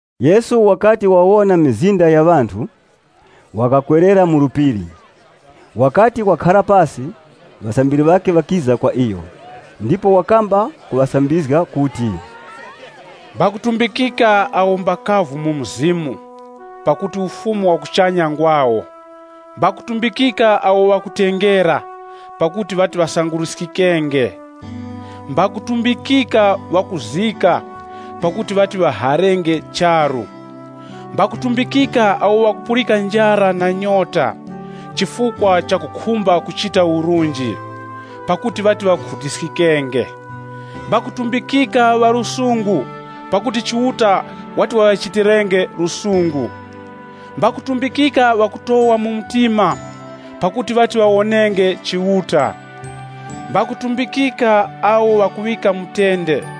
Yesu wakati wawona mizinda ya ŵanthu, wakakwerera mu phiri. Wakati wakhara pasi, ŵasambiri ŵakhe ŵakiza kwa iyo, ndipo wakamba kuŵasambizga kuti, “Mbakutumbikika awo mbakavu mu mzimu, pakuti Ufumu wa kuchanya ngwawo! Mbakutumbikika awo ŵakutengera, pakuti ŵati ŵasanguruskikenge! Mbakutumbikika ŵakuzika, pakuti ŵati ŵaharenge charu. Mbakutumbikika awo ŵakupulika njara na nyota chifukwa chakukhumba kuchita urunji. Pakuti ŵati ŵakhutiskiskenge! Mbakutumbikika ŵa lusungu, pakuti Chiuta wati waŵachitirenge lusungu! Mbakutumbikika ŵakutowa mu mtima, pakuti ŵati ŵawonenge Chiuta! Mbakutumbikika awo ŵakuŵika mutende,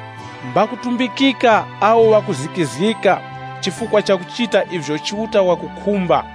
Mbakutumbikika awo ŵakuzikizgika chifukwa chakuchita ivyo Chiuta wakukhumba,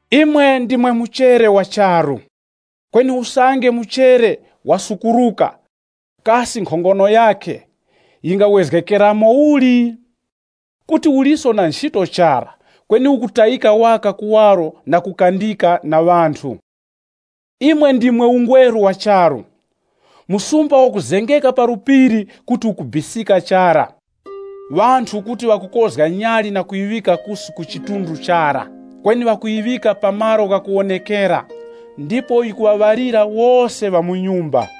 “Imwe ndimwe muchere wa charu. Kweni usange muchere wasukuruka, kasi nkhongono yakhe yingawezgekeramo uli? Kuti uliso na nchito chara kweni ukutayika waka kuwaro na kukandika na ŵanthu. “Imwe ndimwe ungweru wa charu. Msumba wakuzengeka pa phiri kuti ukubisika chara. Ŵanthu kuti ŵakukozga nyali na kuyiŵika kusi ku chidunga chara, kweni ŵakuyiŵika pa malo ghakuwonekera ndipo yikuŵaŵalira wose ŵa mu nyumba.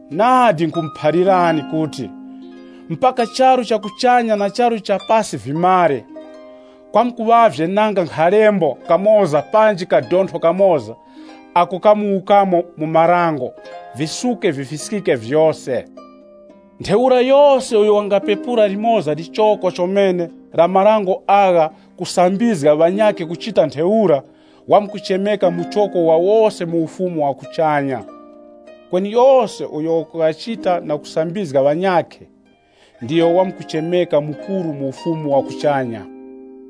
Nadi nkhumuphalirani kuti, mpaka charu cha kuchanya na charu cha pasi vimare, kwamkuŵavye nanga nkhalembo kamoza panji kadontho kamoza ako kamuwukamo mu Dango, visuke vifiskike vyose. Ntheura yose uyo wangapepura limoza lichoko chomene la marango agha kusambizga ŵanyakhe kuchita ntheura, wamkuchemeka muchoko wa wose mu Ufumu wa kuchanya. Kweni yose uyo wakughachita na kusambizga ŵanyakhe, ndiyo wamkuchemeka mukuru mu Ufumu wa kuchanya.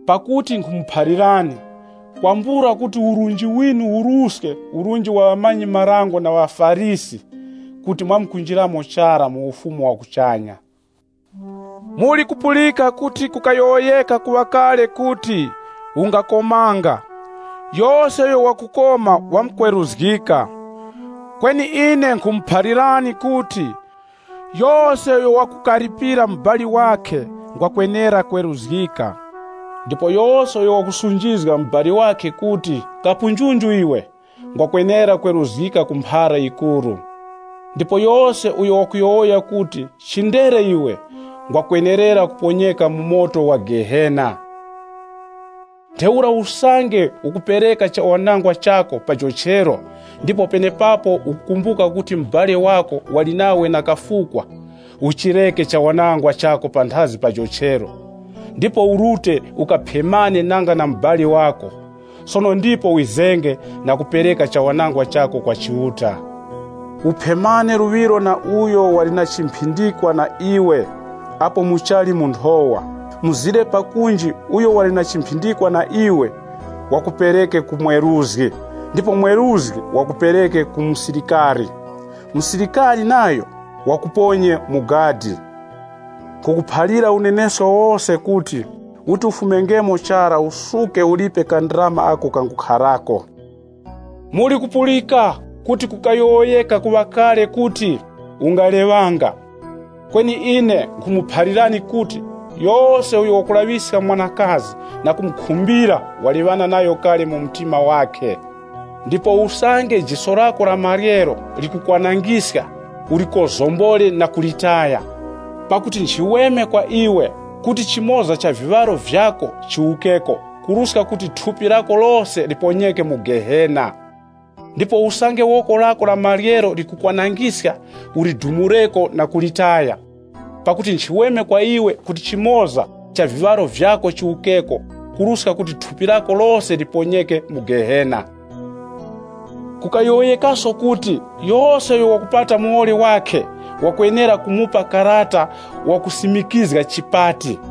Pakuti nkhumuphalirani, kwambula kuti urunji winu uruske urunji wa ŵamanyi-marango na ŵaFarisi, kuti mwamkunjiramo chara mu Ufumu wa kuchanya.” “Mulikupulika kuti kukayowoyeka ku ŵamwaka kuti, ‘Ungakomanga, yose uyo wakukoma wamkweruzgika.’ Kweni ine nkhumuphalirani kuti, yose uyo wakukaripira mubali wakhe mubali wakhe: Malembo ghanyakhe ghakusazgako “kwambula chifukwa”. ngwakwenera kweruzgika. Ndipo yose uyo wakusunjizga mubali wakhe kuti, ‘Kapunjunju iwe’ ngwakwenera kweruzgika ku mphara yikuru. Ndipo yose uyo wakuti, ‘Chindere iwe!’ ngwakwenerera kuponyeka mu Gehena la moto. Ntheura usange ukupereka chawanangwa chako pa jochero ndipo penepapo ukukumbuka kuti mubali wako wali nawe na kafukwa, uchireke chawanangwa chako panthazi pa jochero, ndipo urute ukaphemane nanga na mubali wako, sono ndipo wizenge na kupereka chawanangwa chako kwa Chiuta. “Uphemane luŵiro na uyo wali na chimphindikwa na iwe apo muchali mu nthowa, mzire pakunji uyo wali na chimphindikwa na iwe, wakupereke ku mweruzgi, ndipo mweruzgi wakupereke ku musilikari. Musilikari nayo wakuponye mu gadi. Nkhukuphalira unenesko wose kuti, uti ufumengemo chara usuke ulipe kandarama ako kangukharako.” “Mulikupulika kuti kukayowoyeka ku ŵamwaka kuti, ‘Ungaleŵanga.’ Kweni ine nkhumuphalirani kuti, yose uyo wakulaŵiska mwanakazi na kumukhumbira waleŵana nayo kale mu mtima wakhe. Ndipo usange jiso lako la maryero likukwanangiska, ulikozombore na kulitaya. Pakuti nchiweme kwa iwe kuti chimoza cha viŵaro vyako chiwukeko, kuruska kuti thupi lako lose liponyeke mu Gehena. Ndipo usange woko lako la maryero likukwanangiska, ulidumureko na kulitaya. Pakuti nchiweme kwa iwe kuti chimoza cha viŵaro vyako chiwukeko kuruska kuti thupi lako lose liponyeke mu Gehena. “Kukayowoyekaso kuti, ‘Yose uyo wakupata muwoli wakhe, wakwenera kumupa karata wa chipati.’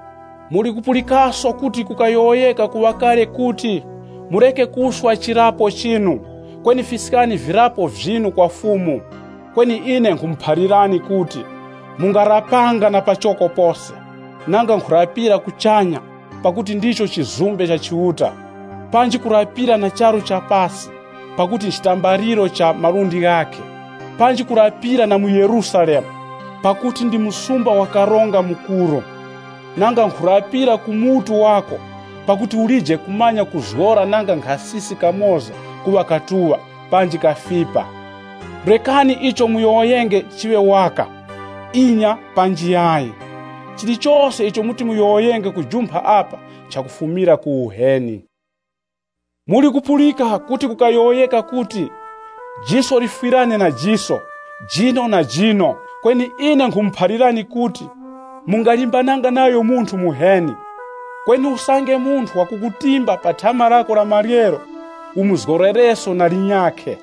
“Mulikupulikaso kuti kukayowoyeka ku ŵamwaka kuti, ‘Mureke kurapira mwa utesi, kweni fiskani virapo vyinu kwa Fumu.’ Kweni ine nkhumuphalirani kuti, mungarapanga na pachoko pose, nanga nkhurapira kuchanya pakuti ndicho chizumbe cha Chiuta. Panji kurapira na charu cha pasi, pakuti nchitambaliro cha malundi ghakhe, panji kurapira na mu Yerusalemu, pakuti ndi msumba wa Karonga Mukuru. Nanga nkhurapira ku mutu wako, pakuti ulije kumanya kuzgora nanga nkhasisi kamoza kuŵa katuŵa, panji kafipa. Rekani icho muyowoyenge chiŵe waka ‘Inya’ panji ‘Yayi’, chilichose icho muti muyowoyenge kujumpha apa nchakufumira ku uheni. “Muli kupulika kuti kukayowoyeka kuti, ‘Jiso lifwirane na jiso, jino na jino.’ Kweni ine nkhumuphalirani kuti, ‘Mungalimbananga nayo munthu muheni.’ Kweni usange munthu wakukutimba pa thama lako la maryero umuzgorereso na linyakhe.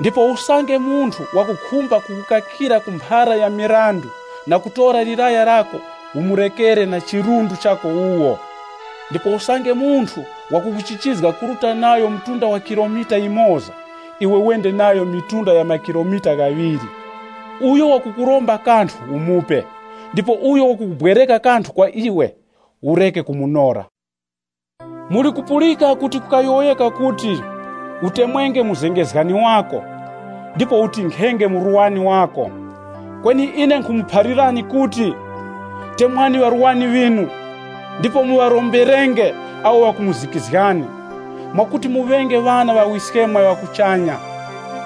Ndipo usange munthu wakukhumba kukutorera ku mphara ya mirandu na kutora laya lako, umurekere na chirundu chako wuwo. Ndipo usange munthu wakukuchichizga kuruta nayo mtunda wa kilomita yimoza, iwe wende nayo mitunda ya makilomita ghaŵiri. Uyo wakukuromba kanthu, umupe. Ndipo uyo wakubwereka kanthu kwa iwe, ureke kumunora. “Mulikupulika kuti kukayowoyeka kuti, ‘Utemwenge muzengezgani wako, ndipo utinkhenge murwani wako.’ Kweni ine nkhumuphalirani kuti, temwani ŵarwani ŵinu, ndipo muŵaromberenge awo ŵakumuzikizgani, mwakuti muŵenge ŵana ŵa Wiskemwe wa kuchanya.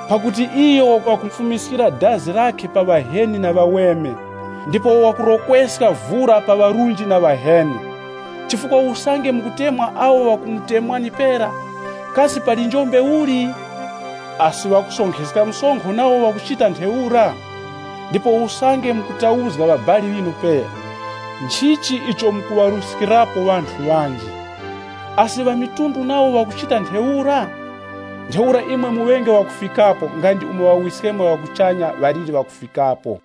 Pakuti iyo wakufumiskira dazi lakhe pa ŵaheni na ŵaweme, ndipo wakurokweska vura pa ŵarunji na ŵaheni. Chifukwa usange mukutemwa awo ŵakumutemwani pera, kasi pali njombe uli? Asi ŵakusonkheska msonkho nawo ŵakuchita ntheura? Ndipo usange mukutauzga ŵabali ŵinu pera, nchichi icho mukuŵaruskirapo ŵanthu ŵanji? Asi ŵamitundu nawo ŵakuchita ntheura? Ntheura imwe muŵenge ŵakufikapo, nga ndi umo Ŵawiskemwe ŵa kuchanya ŵaliri ŵakufikapo.